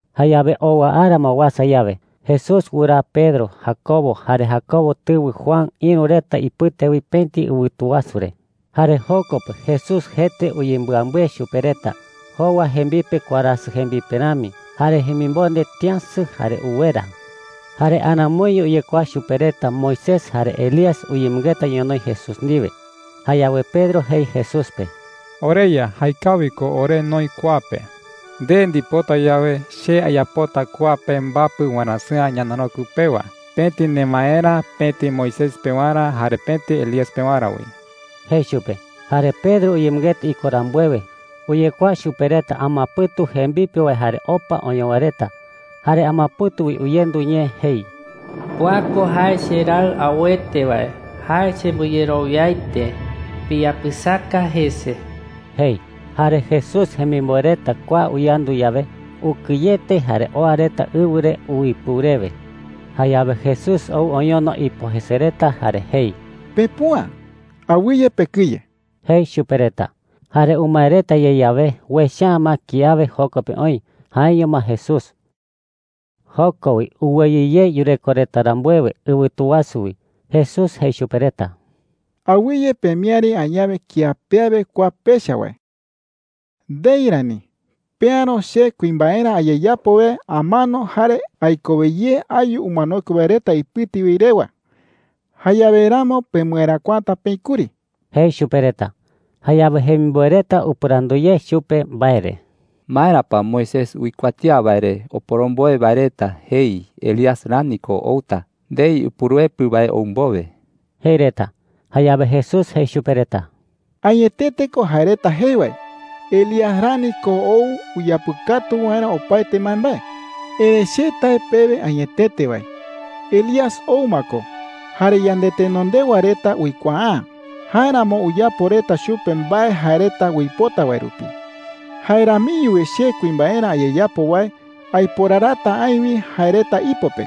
Jayawe owa ara ma uasa yawe, Jesús wɨraa Pedro, Jacobo, jare Jacobo tɨwɨ Juan ïru reta ipɨte wi pëti ɨwɨtu wasu re. Jare joko pe Jesús jete uyembɨambɨe chupe reta. Jowa jembipe warasɨ jembipe rami. Jare jemimonde tïasɨ jare uwera. Jare aramoiño uyekuaa chupe reta Moisés jare Elías uyemɨngeta ñonoï Jesús ndiwe. Jayawe Pedro jei Jesús pe: “OreYa, jaekawi ko ore noï kua pe,” jei chupe. “Nde ndipota yawe, che ayapota kua pe mbapɨ warasɨ̈a ñanarokɨ pewa – pëti nemaerä, pëti Moisés pewarä, jare pëti Elías pewarä wi,” jei chupe. Jare Pedro uyemɨngeta iko rambuewe, uyekuaa chupe reta amapɨ̈tu jembipe wae jare opa oñowa reta. Jare amapɨ̈tu wi uyendu ñee jei: “Kua ko jae cheRaɨ auete wae. Jae chembɨyerowiaete. Piyapɨsaka jese,” jei. Jare Jesús jemimboe reta kua uyandu yawe, ukɨyete jare oa reta ɨwɨ re uipɨu rewe. Jayawe Jesús ou oñono ipo jese reta jare jei: “Pepüa. Awɨye pekɨye,” jei chupe reta. Jare umae reta ye yawe, uecha’ä ma kiawe joko pe oï – jaeño ma Jesús. Joko wi uweyɨ ye yureko reta rambuewe ɨwɨtu wasu wi, Jesús jei chupe reta: “Awɨye pemiäri añawe kía pe awe kua pecha wae. Ndei rani. Peäro che kuimbaerä ayeyapo wae amano jare aikowe ye ayu umanokue wae reta ipɨte wi rewa. Jayawe ramo pemɨeräkuata peï kuri,” jei chupe reta. Jayawe jemimboe reta upɨrandu ye chupe mbae re: “¿Maera pa Moisés uikuatía wae re oporomboe wae reta jei Elías rani ko outa ndei Upuruepɨ wae ou mbowe?” jei reta. Jayawe Jesús jei chupe reta: “Añetete ko jae reta jei wae. Elías rani ko ou uyapɨkatu waerä opaete mbaembae,” jei. “Erëi che tae pewe añetete wae, Elías ou ma ko, jare yandetenondewa reta uikuaa’ä. Jáeramo uyapo reta chupe mbae jae reta uipota wae rupi. Jae ramiño wi che kuimbaerä ayeyapo wae aiporarata aï wi jae reta ipo pe,”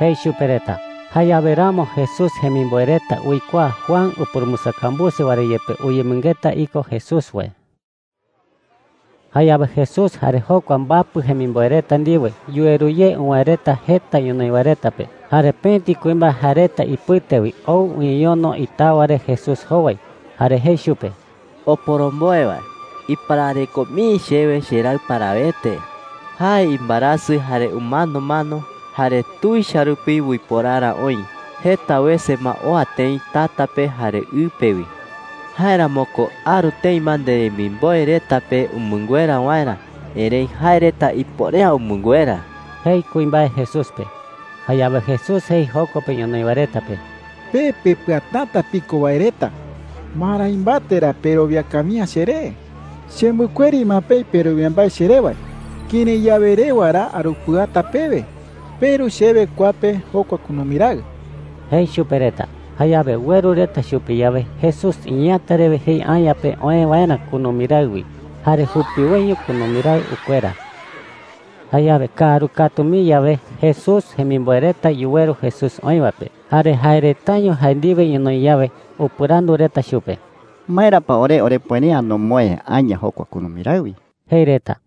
jei chupe reta. Jayawe ramo Jesús jemimboe reta uikuaa Juan upurumbɨsakambuse wae re yepe uyemɨngeta iko Jesús wae. Jayawe Jesús jare jokua mbapɨ jemimboe reta ndiwe yuweru ye uwäe reta jeta ñonoï wae reta pe. Jare pëti kuimbae jae reta ipɨte wi ou uñeñono itawa re Jesús jowai. Jare jei chupe: “Oporomboe wae, iparareko mii chewe cheraɨ parawete,” jei. “Jae imbaerasɨ, jare umanomano, jare tuicha rupi uiporara oï. Jeta wese ma oa tëi tata pe jare ɨ pe wi,” jei. “Jáeramo ko aru tëi ma nderemimboe reta pe umɨnguera waerä, erëi jae reta ipuere’ä umɨnguera,” jei kuimbae Jesús pe. Jayawe Jesús jei joko pe ñonoï wae reta pe: “Pe pepɨatäta piko wae reta, ¿marái mbate ra perowia kawi’ä cheré? Chembɨkueri ma peï perowia mbae cheré wae. ¿Kërái yawe rewa ra arupɨata pewe? Peru chewe kua pe jokua kunumi raɨ,” jei chupe reta. Jayawe ueru reta chupe yawe, Jesús iñeeäta rewe jei aña pe oë waerä kunumi raɨ wi. ¡Jare jupiwoiño kunumi raɨ ukuera! Jayawe kaaru katu mii yawe, Jesús jemimboe reta yuweru Jesús oï wae pe. Jare jae retaño jae ndiwe ñonoï yawe, upɨrandu reta chupe: “¿Maera pa ore orepuere’ä nomoë aña jokua kunumi raɨ wi?” jei reta.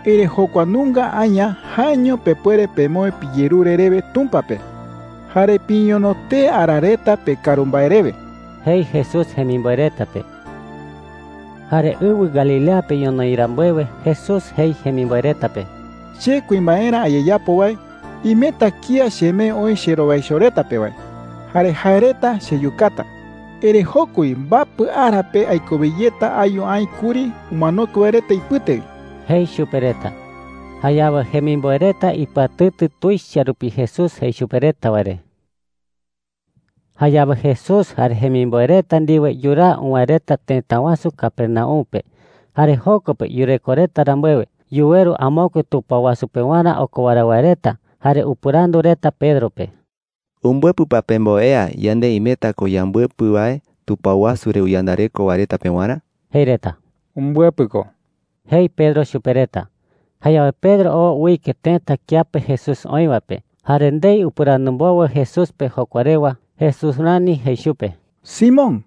“Erëi jokua nunga aña, jaeño pepuere pemoë piyerure rewe Tumpa pe, jare piñono tee ara reta pekaru mbae rewe,” jei Jesús jemimboe reta pe. Jare ɨwɨ Galilea pe ñonoï rambuewe, Jesús jei jemimboe reta pe: “Che kuimbaerä ayeyapo wae, imeta kía chemee oï cherowaicho reta pe wae. Jare jae reta cheyukata,” jei. “Erëi joko wi mbapɨ ara pe aikowe yeta ayu aï kuri umanokue wae reta ipɨte wi,” jei chupe reta. Jayawe jemimboe reta ipɨatɨtɨ tuicha rupi Jesús jei chupe reta wae re. Jayawe Jesús jare jemimboe reta ndiwe yuraa uwäe reta tëta wasu Capernaum pe. Jare joko pe yureko reta rambuewe, yuweru amokue tupao wasu pewarä okowara wae reta jare upɨrandu reta Pedro pe: “¿Umbɨepɨ pa pemboea yande imeta ko yambɨepɨ wae tupao wasu re uyandareko wae reta pewarä?” jei reta. “Umbɨepɨ ko,” jei Pedro chupe reta. Jayawe Pedro oo uike tëta kiape Jesús oï wae pe. Jare ndei upɨrandu mbowe Jesús pe jokua rewa, Jesús rani jei chupe: “Simón,” jei chupe.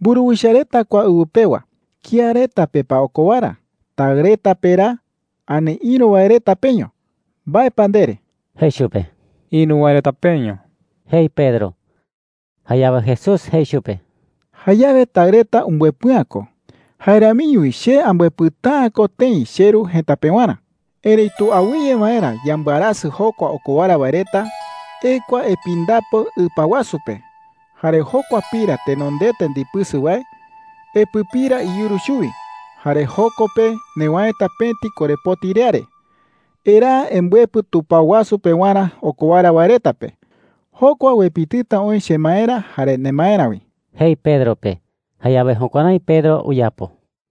“Mburuwicha reta kua ɨwɨ pewa, ¿kía reta pe pa okowara – taɨ reta pe ra ani ïru wae reta peño? ¿Mbae pa ndere?” jei chupe. “Ïru wae reta peño,” jei Pedro. Jayawe Jesús jei chupe: “Jayawe taɨ reta umbɨepɨ'ä ko. Jae ramiño wi che ambɨepɨta’ä ko tëi cheRu jëta pewarä,” jei chupe. “Erëitu awɨye waerä yambɨarasɨ jokua okowara wae reta, ekua epindapo ɨpa wasu pe. Jare jokua pira tenondete ndipɨsɨ wae, epɨpira iyuru chuwi. Jare joko pe newäeta pëti korepoti riare. Eraa embɨepɨ tupao wasu pewarä okowara wae reta pe. Jokua uepitɨta oï chemaerä jare nemaerä wi,” jei Pedro pe. Jayawe jukuärái Pedro uyapo.